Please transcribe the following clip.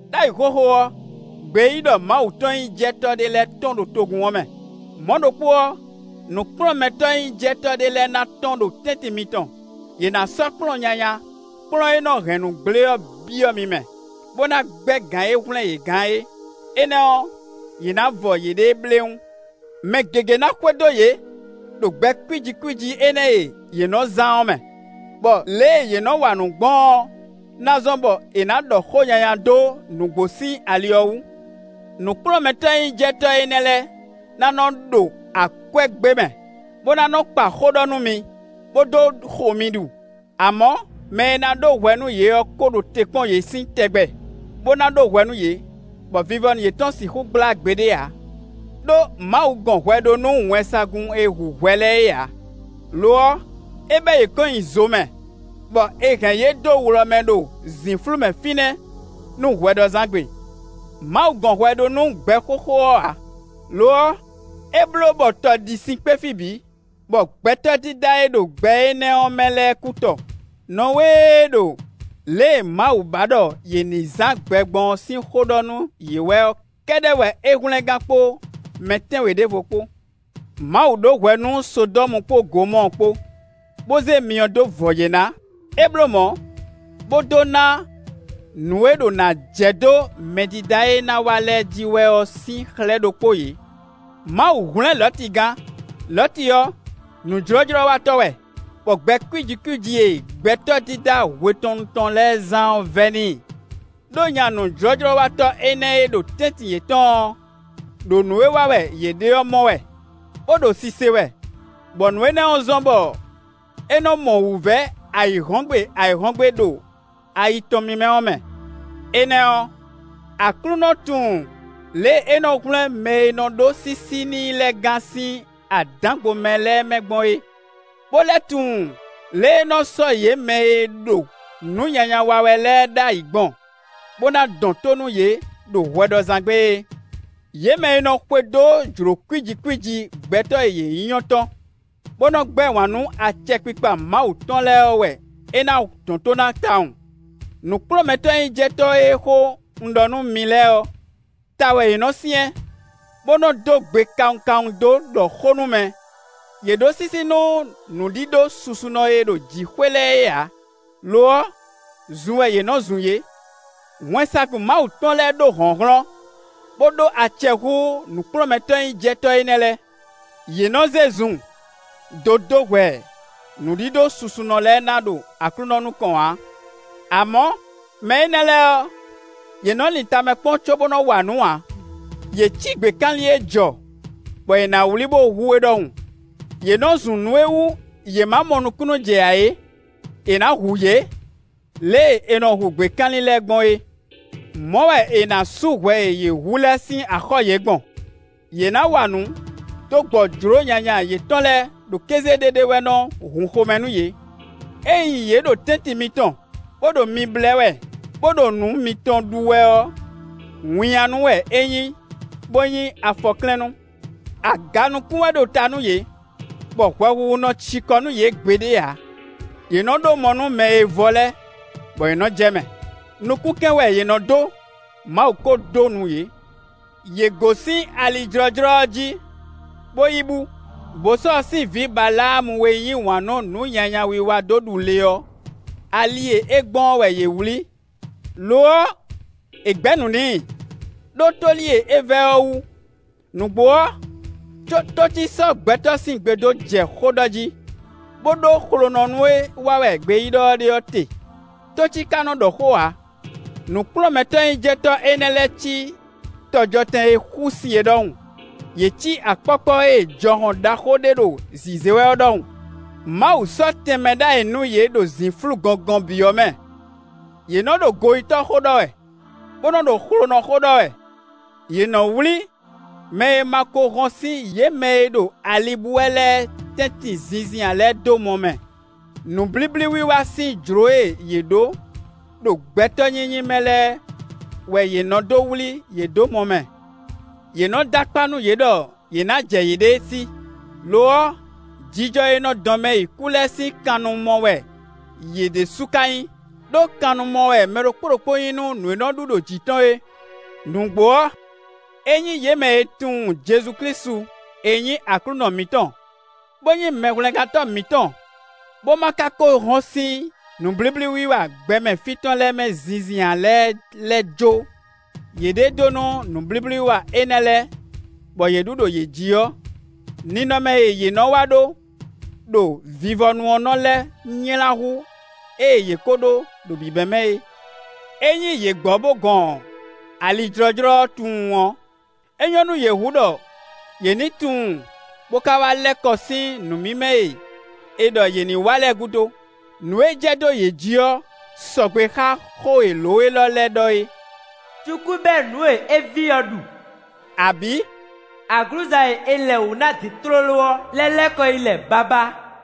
Đ'ayǐ xóxó ɔ́, gbeyíɖɔmawutɔn-nyíjɛtɔ́ ɖé lɛ́ɛ tɔ́n ɖo togun ɔ́ mɛ; mɔ̌ ɖokpó ɔ́, nǔkplɔ́nmɛtɔ́-nyíjɛtɔ́ ɖé lɛ́ɛ ná tɔ́n ɖo tɛ́ntin mitɔn; yě ná sɔ́ kplɔ́n nyanya, kplɔ́n e nɔ hɛn nǔ gblé ɔ́ byɔ́ mi mɛ, bó ná gbɛ́ gǎn e hwlɛ́n yě gán é; énɛ́ ɔ́, yě ná vɔ yěɖée bléwún. Mɛ gěgé ná xwedó yě ɖo gbɛ kwíji kwíji énɛ́ e yě nɔ zán ɔ́ mɛ, bɔ lě e yě nɔ wa nǔ gbɔn ɔ́ ná zɔ́n bɔ è nǎ ɖɔ xó nyanya dó nǔgbó sín ali ɔ́ wú. Nǔkplɔ́nmɛtɔ́-nyíjɛtɔ́ énɛ́ lɛ́ɛ ná nɔ ɖo akwɛ́ gbé mɛ, bó ná nɔ kpa xó ɖɔ nú mi, bó dó xo mi ɖu. Amɔ̌, mɛ e ná ɖó hwɛ nú yě ɔ́ ko ɖo te kpɔ́n yě sín tɛgbɛ, bó ná ɖó hwɛ nú yě, bɔ vivɔ yětɔn sixú gblá gbeɖé ǎ. Đó Mawu gɔn hwɛ ɖó nú wɛnsagun e hu hwɛ lɛ́ɛ é ǎ; lo ɔ́, é bɛ́ yě kɔn nyi zo mɛ, bɔ è hɛn yě dó wlɔ mɛ ɖo zǐnflú mɛ fínɛ́ nú hwɛɖɔzán gbe. Mawu gɔn hwɛ ɖó nú gbɛ xóxó ɔ́ ǎ; lo ɔ́, é bló bɔ tɔ ɖi sin kpé fí bǐ, bɔ gbɛtɔ́ dídá e ɖo gbɛ énɛ́ ɔ́ mɛ lɛ́ɛ kú tɔ. Nɔwée e ɖo lě e Mawu ba ɖɔ yě ní zán gbɛ gbɔn ɔ́ sín xó ɖɔ nú yě wɛ ɔ́ kɛ́ɖɛ́ wɛ é hwlɛ́n gán kpó mɛ tɛ́nwe ɖěvo kpó. Mawu ɖó hwɛ nú Sodɔ́mu kpó Gomɔ́ɔ kpó, bó zé myɔ dó vɔ yě ná; é bló mɔ̌, bó dó ná nǔ e ɖo ná jɛ dó mɛdídá e ná wá lɛ́ɛ jí wɛ ɔ́ sín xlɛ́ ɖokpó yě. Mawu hwlɛ́n Lɔ̌ti gán; Lɔ̌ti ɔ́, nǔjlɔ́jlɔ́watɔ́ wɛ, bɔ gbɛ kwíji kwíji e gbɛtɔ́ dídá hwetɔnnu tɔn lɛ́ɛ zán ɔ́ vɛ́ n'i. Đó nya nǔjlɔ́jlɔ́watɔ́ énɛ́ e ɖo tɛ́ntin yětɔn ɔ́, ɖo nǔ e wa wɛ yě ɖe ɔ́ mɔ wɛ, bó ɖo sise wɛ, bɔ nǔ énɛ́ zɔ́n bɔ é nɔ mɔ wǔvɛ́ ayǐhɔ́ngbe ayǐhɔ́ngbe ɖo ayi tɔn mímɛ́ ɔ́ mɛ. Énɛ́ ɔ́, Aklúnɔ tunwun lě e é nɔ hwlɛ́n mɛ e nɔ ɖó sísí n'i lɛ́ɛ gán sín adǎngbomɛ lɛ́ɛ mɛ gbɔn é, bó lɛ́ tunwun lě e é nɔ sɔ́ yě mɛ e ɖo nǔ nyanya wa wɛ lɛ́ɛ ɖ'ayǐ gbɔn, bó ná dɔn tó nú yě ɖo hwɛɖɔzán gbe é. Yě mɛ e nɔ xwedó jlǒ kwíji kwíji gbɛtɔ́ e yě nyí ɔ́ tɔn, bó nɔ gbɛ́ wǎn nú acɛkpikpa Mawu tɔn lɛ́ɛ ɔ́ wɛ é ná dɔn tó ná tawun. Nǔkplɔ́nmɛtɔ́-nyíjɛtɔ́ e xó un ɖɔ nú mi lɛ́ɛ ɔ́, ta wɛ yě nɔ syɛ́n, bó nɔ dó gbe kawun kawun dó ɖɔ xó nú mɛ; yě ɖó sísí nú nǔɖíɖó susunɔ e ɖo jǐxwé lɛ́ɛ é ǎ; lo ɔ́, zun wɛ yě nɔ zun yě. Wɛnsagun Mawu tɔn lɛ́ɛ ɖó hlɔ̌nhlɔ́n, bó ɖó acɛ hú nǔkplɔ́nmɛtɔ́-nyíjɛtɔ́ énɛ́ lɛ́ɛ, yě nɔ zé zun dó dó hwɛ nǔɖíɖó susunɔ lɛ́ɛ ná ɖo Aklúnɔ nukɔn ǎ. Amɔ̌, mɛ énɛ́ lɛ́ɛ ɔ́, yě nɔ lin tamɛ kpɔ́n cóbó nɔ wa nǔ ǎ; yě cí gběkanlin e jɔ, bɔ è nǎ wlí bó hu é ɖɔhun; yě nɔ zun nǔ e wú yě ma mɔ nukúnnú jɛ ǎ é; è nǎ hu yě lě e è nɔ hu gběkanlin lɛ́ɛ gbɔn é. Mɔ̌ wɛ è nǎ sú hwɛ e yě hu lɛ́ɛ sín axɔ́ yě gbɔn. Yě ná wa nǔ dó gbɔ jlǒ nyanya yětɔn lɛ́ɛ ɖo kéze ɖéɖé wɛ nɔ hun xomɛ nú yě. Ényí yě ɖo tɛ́ntin mitɔn, bó ɖo mi blɛ́ wɛ, bó ɖo nǔ mitɔn ɖu wɛ ɔ́, winnyánú wɛ é nyí, bó nyí afɔklɛ́nnú. Aga nukún wɛ ɖo ta nú yě, bɔ hwɛhuhu nɔ ci kɔ nú yě gbeɖé ǎ. Yě nɔ ɖó mɔ nú mɛ e vɔ́ lɛ́ɛ, bɔ yě nɔ jɛ mɛ; nukúnkɛn wɛ yě nɔ dó; Mawu ko dó nu yě. Yě gosín ali jlɔ́jlɔ́ ɔ́ jí, bó yi bú; Bosɔ́ɔ sín vǐ Baláamu e yí wǎn nú nǔ nyanya wiwa dó ɖu le ɔ́, ali e é gbɔn ɔ́ wɛ yě wlǐ. Lo ɔ́, è gbɛ̌ nǔ n'i, ɖó tóli e é vɛ́ ɔ́ wú. Nǔgbó ɔ́, tócí sɔ́ gbɛtɔ́ sín gbe dó jɛ xó ɖɔ jí, bó ɖó xlonɔnú e wa wɛ gbeyíɖɔ ɔ́ ɖe ɔ́ te; tócí ka nɔ ɖɔ xó ǎ. Nǔkplɔ́nmɛtɔ́-nyíjɛtɔ́ énɛ́ lɛ́ɛ cí tɔjɔtɛn e xusin é ɖɔhun; yě cí akpɔ́kpɔ́ e jɔhɔn ɖaxó ɖé ɖo zǐzé wɛ ɔ́ ɖɔhun; Mawu sɔ́ tɛnmɛ ɖ'ayǐ nú yě ɖo zǐnflú gɔngɔn bǐ ɔ́ mɛ. Yě nɔ ɖo goyítɔ́ xó ɖɔ wɛ, bó nɔ ɖo xlonɔ xó ɖɔ wɛ; yě nɔ wlí mɛ e ma ko hɔn sín yě mɛ e ɖo ali bú wɛ lɛ́ɛ tɛ́ntin zinzin ǎ lɛ́ɛ dó mɔ mɛ; nǔblíblí wiwa sín jlǒ e yě ɖó ɖo gbɛtɔ́ nyínyí mɛ lɛ́ɛ wɛ yě nɔ́ dó wlí yě dó mɔ mɛ. Yě nɔ dó akpá nú yě ɖɔ yě ná jɛ yěɖée sí; lo ɔ́, jijɔ e nɔ dɔn mɛ yi kú lɛ́ɛ sín kannumɔ wɛ yě ɖésú ka nyí; ɖó kannumɔ wɛ mɛ ɖokpó ɖokpó nyí nú nǔ e nɔ ɖu ɖo jǐ tɔn é. Nǔgbó ɔ́, ényí yě mɛ e tunwun Jezu Klísu e nyí Aklúnɔ mǐtɔn, bó nyí Mɛhwlɛ́ngántɔ́ mǐtɔn, bó ma ka ko hɔn sín nǔblíblíwiwa gbɛmɛ fí tɔn lɛ́ɛ mɛ zinzin ǎ lɛ́ɛ lɛ́ jó yěɖée dó nú nǔblíblíwiwa énɛ́ lɛ́ɛ, bɔ yě ɖu ɖo yě jí ɔ́, ninɔmɛ e yě nɔ wá ɖó ɖo vivɔnu ɔ́ nɔ lɛ́ nylá hú ée yě ko ɖó ɖo bǐbɛ́mɛ é. Ényí yě gbɔ bó gɔn ali jlɔ́jlɔ́ ɔ́ tunwun ɔ́, é nyɔ́ nú yě hú ɖɔ yě ní tunwun bó ka wá lɛ́ kɔ sín nǔ mímɛ́ e è ɖɔ yě ní wa lɛ́ɛ gúdo. Nǔ e jɛ dó yě jí ɔ́ sɔgbe xá xó e lǒ élɔ́ lɛ́ɛ ɖɔ é: “Cukú bɛ́ nǔ e é vi ɔ́ ɖu”, abǐ “Aglǔza e è lɛ wǔ ná din tlóló ɔ́ lɛ́ lɛ́ kɔ yi lɛ babá.”